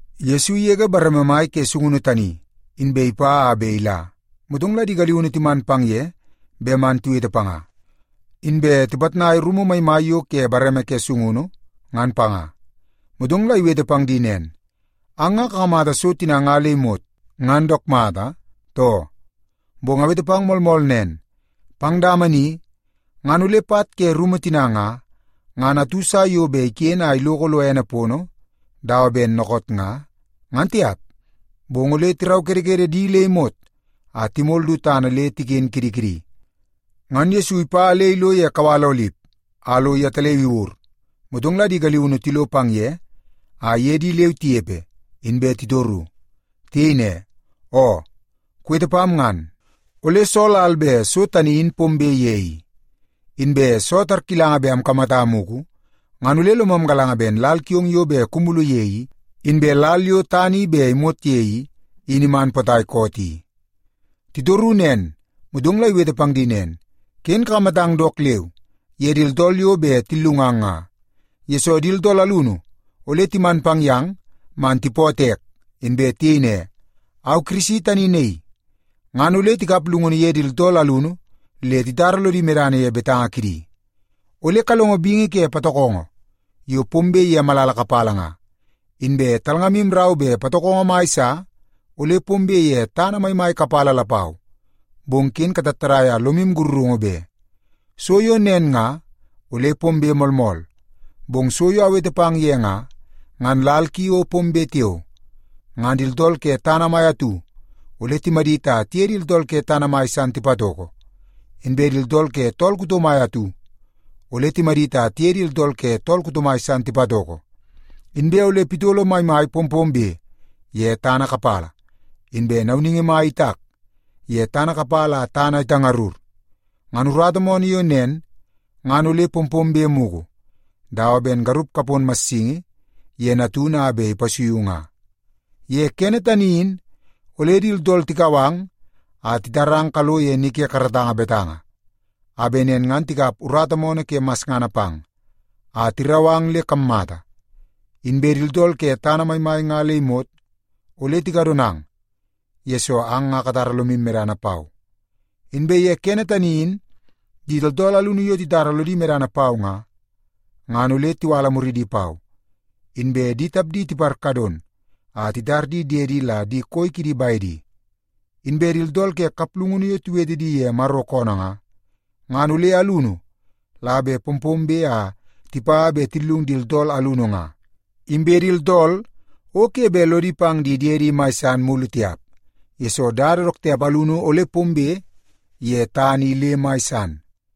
Yesu igege bareme mai ke sungunu tani, inbe ipa a bet ila. Motong la di galiunu timan pang ye bet man tiwete panga, inbe tipitnai rumu maimai yo ke bareme ke sungunu, ngan panga. Motong la iwete pang di nen, “Ang nga kakamata so tina nga le imot ngan dook mata, too? Bong awete pang moolmool nen, pang dama ni ngan ole pat ke rumu tina nga, ngan atu sa yo bet iken a iloko lo ene pono dawa ben dookoot nga, ngan tiap. Bong ole tiraukedekede di le imot a timol du tana le tiken kidi kidi.” Ngan Yesu ipa le ilo ye kawal Olip a lo yetaleu iwur, motong la di galiunu tilo pang ye a iye di leu tinepe, inbe titoru. Tiyei ne, “Oo, kuwete pam ngan, ole soo lal bet so tani in pombe ye i? Inbe soo tarkilanga bet amkamata mugu, ngan ole lomam galanga ben lal kiong yo bet kumulu ye i, inbe lal yo tana i bet imot ye i, in iman potai koot i?” Titoru nen, motong la iwete pang di nen, “Ken kakamatang dook leu ye di tooltool yo bet tillungang nga. Yesoo, di tooltool alunu ole timan pang yang man tipootoo ek, inbe tiyei ne, ‘Au Kirisi tani naii!’ Ngan ole tikap llungunu ye di tooltool alunu le titara lodi medana ye betanga kidi. Ole kalongo bingi ke patokongo yo pombe ye malala kapala nga, inbe talngamu rau bet patokongo mai sa ole pombe ye tana maimai kapala lapau, bong ken katattadai a lomu sakarungu be. So yo nen nga ole pombe moolmool, bong so yo awete pang ye nga, ngan lal ki o pombe tiao. Ngan di tooltool ke tana mai atu ole timadit a tiye di tooltool ke tana mai san tipatoko. Inbe di tooltool ke tool kuto mai atu ole timadit a tiye di tooltool ke tool kuto mai san tipatoko. Inbe ole pitolo maimai pompombe ye tana kapala, inbe nauningi mai itak ye tana kapala a tana itangarur. Ngan urata moonoo yo nen ngan ole pompombe mugu, dawa ben garup kapon massingi ye natunu a bet ipasuiu nga. “Ye kene tani in, ole di tooltool tikau ang a titarang kalo ye ni ke karatanga betanga, a bet nen ngan tikap urata moonoo ke masngana pang, a tirau ang le kammata. Inbe di tooltool ke tana maimai nga le imot ole tikadonang, yesoo ang nga katara lomu medana pau. Inbe ye kene tani in, di tooltool alunu yo titara lodi medana pau nga, ngan ole tiwala muridi pau, inbe di tapdi tiparkadon a titar di diedi la di koi kidi bedi. Inbe di tooltool ke kaplungunu yo tiwete di ye Maro koonoo nga, ngan ole alunu la bet pompombe a tipa bet tillungu di tooltool alunu nga. Inbe di tooltool o ke bet lodi pang di diedi mai san mulu tiap, yesoo dada dook tiap alunu ole pombe ye tana i le mai san.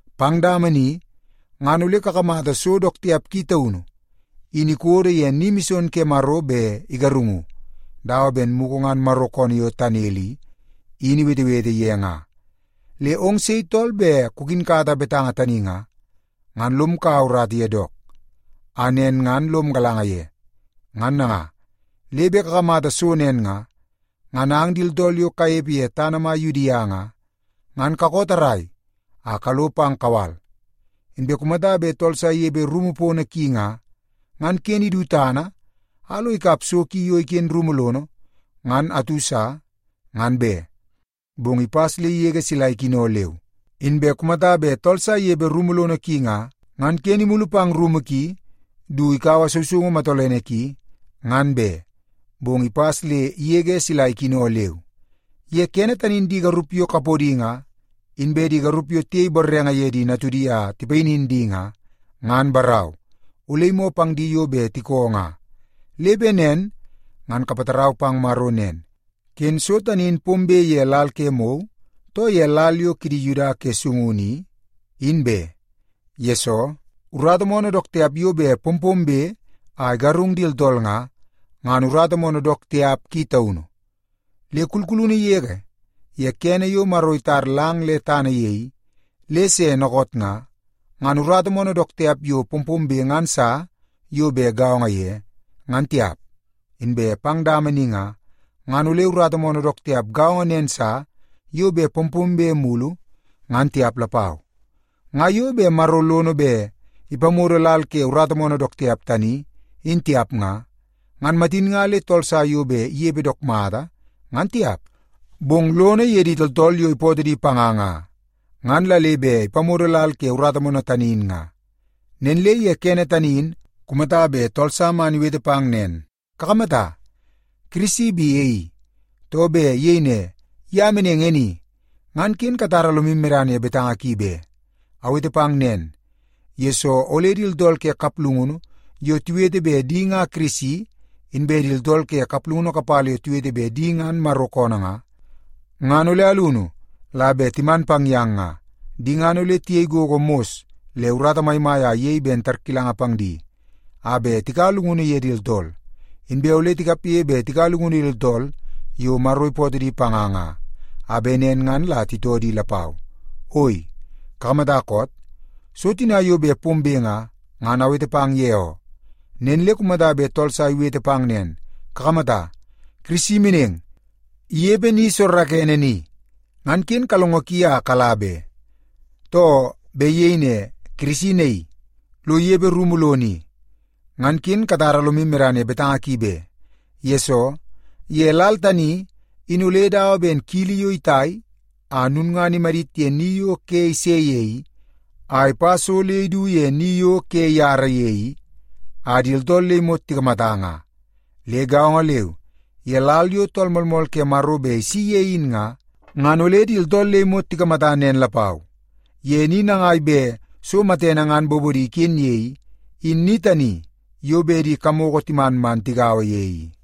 “Pang dama ni ngan ole kakamata so dook tiap ki taunu in ikodo ye ni mison ke Maro bet igarungu, dawa ben mugu ngan Maro koonoo yo Tanel i, in iwetewete ye nga. Le ong sei tooltool bet kukinkata betanga tani nga, ngan lom kaua urata ye dook, a nen ngan lom galanga ye. Ngan nanga, le bet kakamata so nen nga, ngan ang di tooltool yo kanepe ye tana mai Yudia nga, ngan kakoo tarrai a kalo pang kawal. Inbe kumata bet tool sa inepe rumu pono ki nga, ngan ken idu tana a lo ikaua so ki yo iken rumu lono ngan atu sa, ngan be, bong ipas le igege sila ikino leu. Inbe kumata bet tool sa inepe kumu lono ki nga, ngan ken imulu pang rumu ki du ikaua sousoungu matolene ki, ngan be, bong ipas le igege sila ikino leu. Ye kene tani in di garup yo kapodi nga, inbe di garup yo tiyei borrenge ye di natudi a tipayinin di nga, ngan barau, ole imoo pang di yo bet tikoo nga. Le bet nen ngan kapatarau pang Maro nen, ken so tani in pombe ye lal ke mou, too ye lal yo kidi Yuda ke sungunu i, in be. Yesoo, urata moonoo dook tiap yo bet pompombe a igarung di tooltool nga, ngan urata moonoo dook tiap ki taunu. Le kulkulunu yege ye kene yo Maro itar lang le tana ye i, le se dookoot nga, ngan urata moonoo dook tiap yo pompombe ngan sa yo bet gaongo ye, ngan tiap. Inbe pang dama ni nga, ngan ole urata moonoo dook tiap gaongo nen sa yo bet pompombe mulu, ngan tiap lapau. Nga yo bet Maro lono bet ipamodo lal ke urata moonoo dook tiap tani in tiap nga, ngan matin nga le tool sa yo bet inepe dook mata, ngan tiap. Bong lono ye di tooltool yo ipootoo di panga nga, ngan la le bet ipamodo lal ke urata moonoo tani in nga. “Nen le ye kene tani in, kumata bet tool sa man iwete pang nen, ‘Kakamata, Kirisi bi e i!’ too, bet iyei ne, ‘Ye meneng e ni!’ ngan ken katara lomu medana ye betanga ki be. Awete pang nen, yesoo ole di tooltool ke kaplungunu yo tiwete bet di nga Kirisi, inbe di tooltool ke kaplungunu kapala yo tiwete bet di ngan Maro koonoo nga, ngan ole alunu la bet timan pang yang nga. Di ngan ole tiyei gogo mos le urata maimai a iyei ben tarkilanga pang di, a bet tikaua llungunu ye di tooltool. Inbe ole tikapge bet tikaua llungunu ye di tooltool yo Maro ipootoo di panga nga, a bet nen ngan la titoo di lapau. Oi, kakamata koot? So tina yo bet pombe nga, ngan awete pang ye oo. “Nen le kumata bet tool sa iwete pang nen, ‘Kakamata, Kirisi meneng, inepe ni soorookoonoo ni,’ ngan ken kalongo ki a kala be. Too, bet iyei ne, ‘Kirisi naii, lo inepe rumu lono i,’ ngan ken katara lomu medana ye betanga ki be. Yesoo, ye lal tani, in ole dawa ben kili yo itai a lulngana imadit ye ni yo ke ise ye i, a ipa so le idu ye ni yo ke iyara ye i a di tooltool le imot tikamata nga. Le gaongo leu ye lal yo Tool Moolmool ke Maro bet isi ye in nga, ngan ole di tooltool le imot tikamata nen lapau. Ye ni nangai bet so matene ngan bobono iken ye i, in ni tani yo bet di kamoko timan man tigaua ye i.”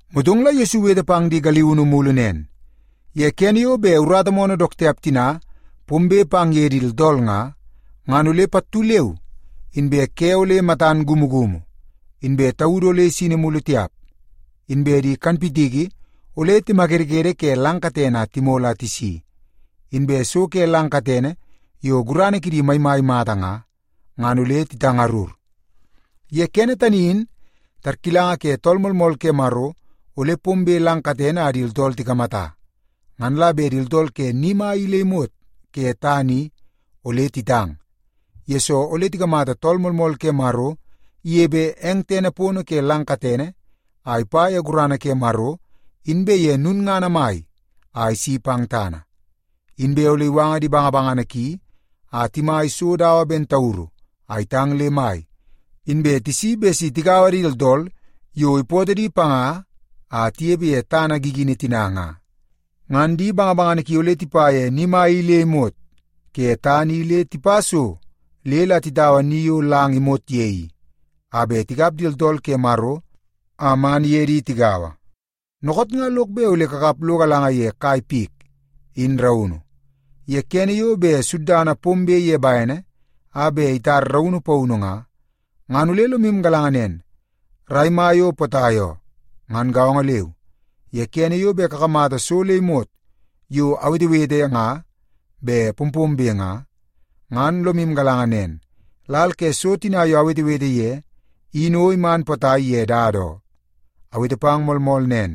Motong la Yesu iwete pang di galiunu mulu nen, “Ye kene yo bet urata moonoo dook tiap tina ngan pombe pang ye di tooltool nga, ngan ole pattu leu inbe ‘ke ole matan kumukumu, inbe taudu ole isini mulu tiap. Inbe di kanpitiki ole timakedekede ke lang katene a timol a tisi, inbe so ke lang katene yo gurana kidi maimai mata nga, ngan ole titangarur.’ “Ye kene tani in, tarkilanga ke Tool Moolmool ke Maro, ole pombe lang katene a di tooltool tikamata. Ngan la bet di tooltool ke ni mai i le imot ke tana i ole titang, yesoo ole tikamata Tool Moolmool ke Maro inepe eng tene pono ke lang katene, a ipa ye gurana ke Maro inbe ye lulngana mai a isi pang tana. Inbe ole iwanga di bangabangana ki a timai so dawa ben tauru a itang le mai, inbe tisi bet si tigaua di tooltool yo ipootoo di panga a tinepe ye tana gigini tina nga. Ngan di bangabangana ki ole tipa ye ni mai i le imot ke tana i le tipa so le la titaua ni yo lang imot ye i, a bet tikap di tooltool ke Maro a man iye di tigaua. “Dookoot nga lok bet ole kakap lo galanga ye kai pik in raunu. Ye kene yo bet suddana pombe ye bene a bet itar raunu paunu nga, ngan ole lomu galanga nen, rai mai o potai oo. Ngan gaongo leu, ye kene yo bet kakamata so le imot yo awetewete nga bet pompombe nga, ngan lomu galanga nen, lal ke so tina yo awetewete ye in o iman potai ye dada oo. Awete pang moolmool nen,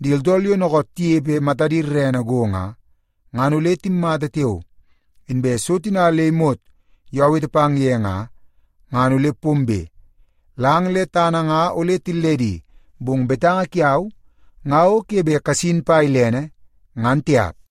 di tooltool yo dookoot tinepe matadi rerene go nga, ngan ole timmata tiao, inbe so tina le imot yo awete pang ye nga, ngan ole pombe. Lang le tana nga ole tilledi, bong betanga kiau nga o ke bet kasin pa ilene, ngan tiap.”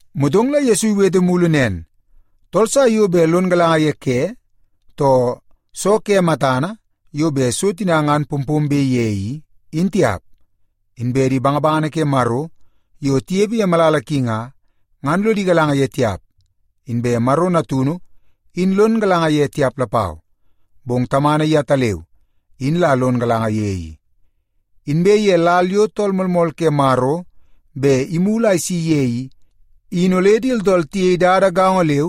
Motong la Yesu iwete mulu nen, “Tool sa yo bet lon galanga ye ke, too soo ke matana yo bet so tina ngan pompombe ye i, in tiap. Inbe di bangabangana ke Maro yo tinepe ye malala ki nga, ngan lodi galanga ye tiap, inbe Maro Natunu in lon galanga ye tiap lapau, bong Tamana yetaleu in la lon galanga ye i. Inbe ye lal yo Tool Moolmool ke Maro bet imulu a isi ye i, in ole di tooltool tiyei dada gaongo leu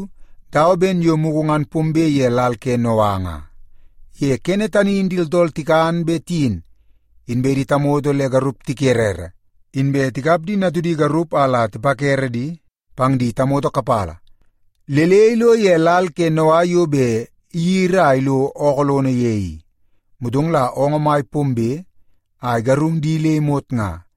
dawa ben yo mugu ngan pombe ye lal ke Noa nga. Ye kene tani in di tooltool tikan bet tiyin, inbe tamoto le garup tikerere, inbe tikap di natudi garup a la tipakere di pang di tamoto kapala, le le ilo ye lal ke Noa yo bet iyiri a ilo ookoo lono ye i. Motong la oongoo mai pombe a igarung di le imot nga.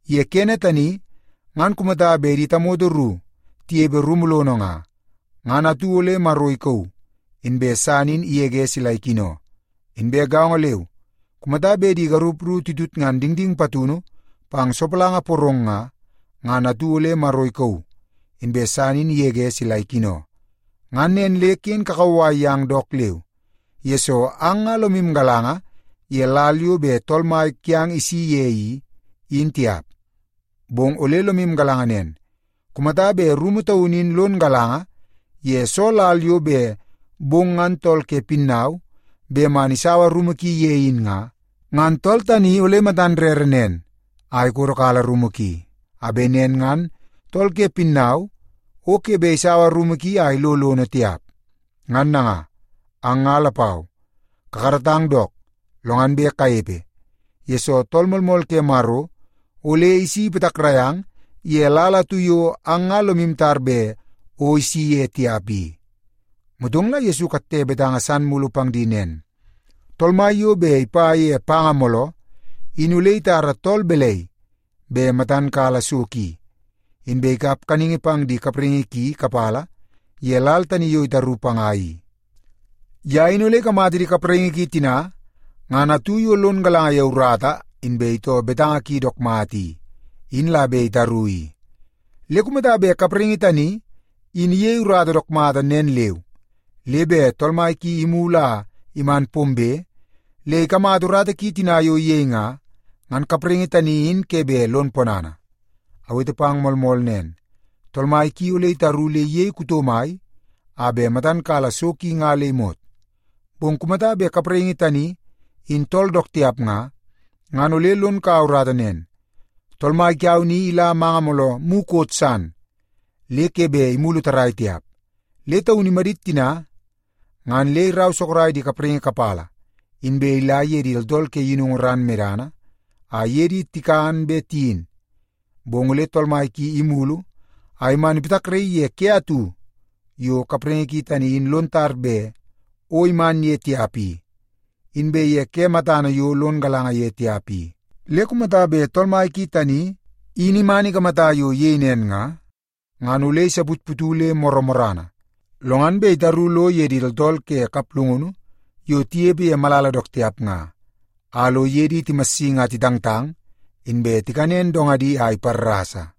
Ye kene tani, ngan kumata bet di tamoto ru tinepe kumu lono nga, ngan atu ole Maro ikauu, inbe san in igege sila ikino. Inbe gaongo leu, kumata bet di garup ru titutngan dingding patunu pang sopalanga porong nga, ngan atu ole Maro ikauu, inbe san in igege sila ikino. “Ngan nen le ken kakauwai yang dook leu, yesoo ang nga lomu galanga ye lal yo bet Tool Mai kiang isi ye i, in tiap. Bong ole lomu galanga nen. Kumata bet rumu taunu in lon galanga ye soo lal yo bet bong ngan tool ke pinnau bet man isaua rumu ki ye in nga, ngan tool tani ole matan rere nen a ikodokala rumu ki, a bet nen ngan tool ke pinnau o ke bet isaua rumu ki a ilo lono tiap. Ngan nanga, ang nga lapau kakaratang dook, lo ngan bet kanepe, yesoo Tool Moolmool ke Maro ole isi ipatakrai ang ye lal atu yo ang nga lomu tar bet o isi ye tiap i.” Motong la Yesu ikatte betanga san mulu pang di nen, “Tool mai yo bet ipa ye panga mooloo, in ole itara tool balai bet matan kala so ki, inbe ikap kaningi pang di kapraingi ki kapala ye lal tani yo itaru panga i? Ye in ole ikamata di kapraingi ki tina ngan atu yo lon galanga ye urata inbe itoo betanga ki dook mata i, in la bet itaru i. Le kumata bet kapraingi tani in iyei urata dook mata nen leu, le bet tool mai ki imulu a iman pombe le ikamata urata tina yo iyei nga, ngan kapraingi tani in ke bet lon ponana. Awete pang moolmool nen, tool mai ki ole itaru le iyei kuto mai a bet matan kala so ki nga le imot. Bong kumata bet kapraingi tani in tool dook tiap nga, ngan ole lon kaua urata nen, ‘Tool mai kiau ni ila manga mooloo mukot san le ke bet imulu tarrai tiap.’ Le taun imadit tina ngan le irau sorok di kapraingi kapala, inbe ila ye di tooltool ke yinungu ran medana, a iye di tikan be tiyin. Bong ole tool mai ki imulu a iman ipatakraii ye ke atu yo kapraingi ki tani in lon tar bet o iman ye tiap i, inbe ye ke matana yo lon galanga ye tiap i. Le kumata bet tool mai ki tani in iman ikamata yo iyei nen nga, ngan ole isaputputu le morrana, lo ngan bet itaru lo ye di tooltool ke kaplungunu yo tinepe ye malala dook tiap nga, a lo iye di timassingi a titangtang, inbe tikanen dongadi a iparrasa.”